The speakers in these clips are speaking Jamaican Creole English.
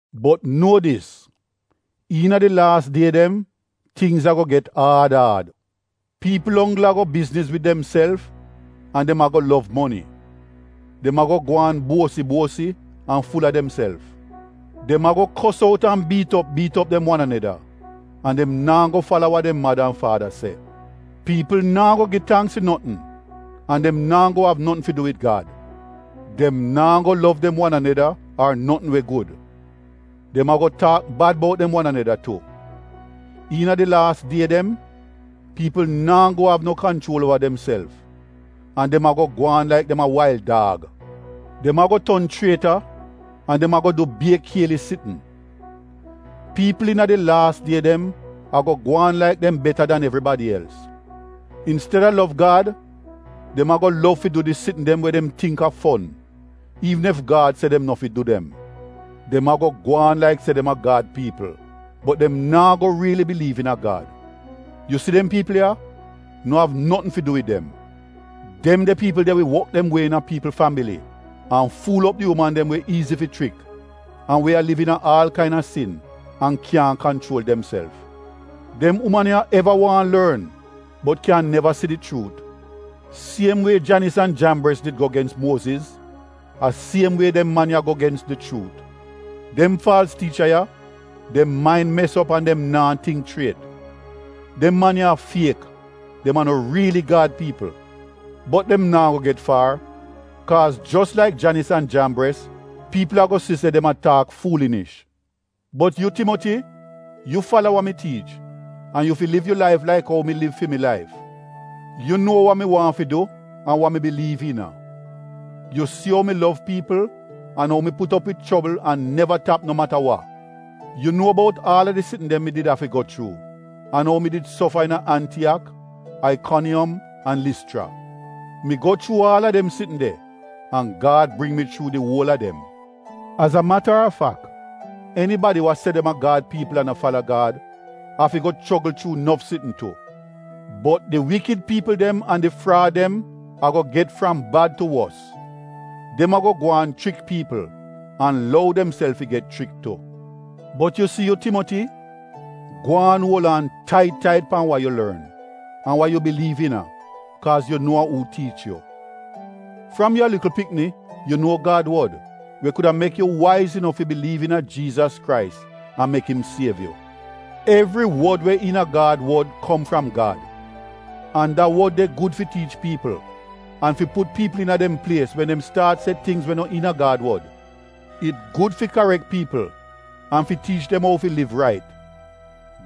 Bot nuo dis, iina di laas die dem tingz ago get aad aad. Piipl onggl ago bizniz wid demself an dem ago lov moni. Dem ago gwaan buosi-buosi an ful-a demself. Dem ago kos out an biit op biit op dem wan aneda an dem naa go fala wa dem mada an faada se. Piipl naa go gi tangks fi notn an dem naa go av notn fi du wid Gad. Dem naa go lov dem wan aneda ar notn we gud. Dem ago taak bad bout dem wan aneda tu. Iina di laas die dem, piipl naa go av no kanchuol uova demself an dem ago gwaan laik dem a wail daag. Dem ago ton chrieta an dem ago du bier kielis sitn. Piipl iina di laas die dem ago gwaan laik dem beta dan evribadi els. Insteda lov Gad dem ago lov fi du di sitn dem we dem tingk a fon, iivn ef Gad se dem no fi du dem. Dem ago gwaan laik se dem a Gad piipl bot dem naa go riili biliiv iina Gad. Yu si dem piipl ya, no av notn fi du wid dem. Dem de piipl de wi wok dem wie iina piipl fambili an fuul op di uman dem we iizi fi chrik an we a liv iina aal kaina sin an kyaahn kanchuol demself. Dem uman ya eva waahn lorn bot kyan neva si di chuut. Siem wie Janis an Jambres did go gens Muoziz, a siem wie dem man ya go gens di chuut. Dem faalz tiicha ya, dem main mes op an dem naa tingk chriet. Dem man ya a fiek, dem a no riili Gad piipl. Bot dem naa go get faar kaaz jos laik Janis an Jambres, piipl ago si se dem a taak fuulinish. Bot yu Timoti, yu fala wa mi tiich an yu fi liv yu laif laik ou mi liv fi mi laif. Yu nuo wa mi waahn fi du an wa mi biliiv iina. Yu si ou mi lov piipl an ou mi put op wid chobl an neva tap no mata wa. Yu nuo bout aal a di sitn dem mi did afi go chuu an ou mi did sofa iina Antiyak, Aikoniyom an Lischra. Mi go chuu aal a dem sitn de an Gad bring mi chuu di uol a dem. Az a mata a fak, enibadi we se dem a Gad piipl an a fala Gad, afi go chogl chuu nof sitn tu. Bot di wikid piipl dem an di fraad dem ago get fram bad tu wos. Dem ago gwaan chrik piipl an lou demself fi get chrik tu. Bot yu si yu Timoti, gwaan uol aan tait tait pan wa yu lorn an wa yu biliiv iina kaaz yu nuo a uu tiich yu. Fram yu a likl pikni yu nuo Gad wod we kuda mek yu waiz inof fi biliiv iina Jiizas Krais an mek im siev yu. Evri wod we iina Gad wod kom fram Gad. An da Wod de gud fi tiich piipl an fi put piipl iina dem plies wen dem staat se tingz we no iina Gad wod. It gud fi karek piipl an fi tiich dem ou fi liv rait.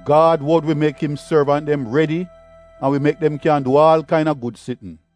Gad wod wi mek im sorvant dem redi an wi mek dem kyan du aal kaina gud sitn.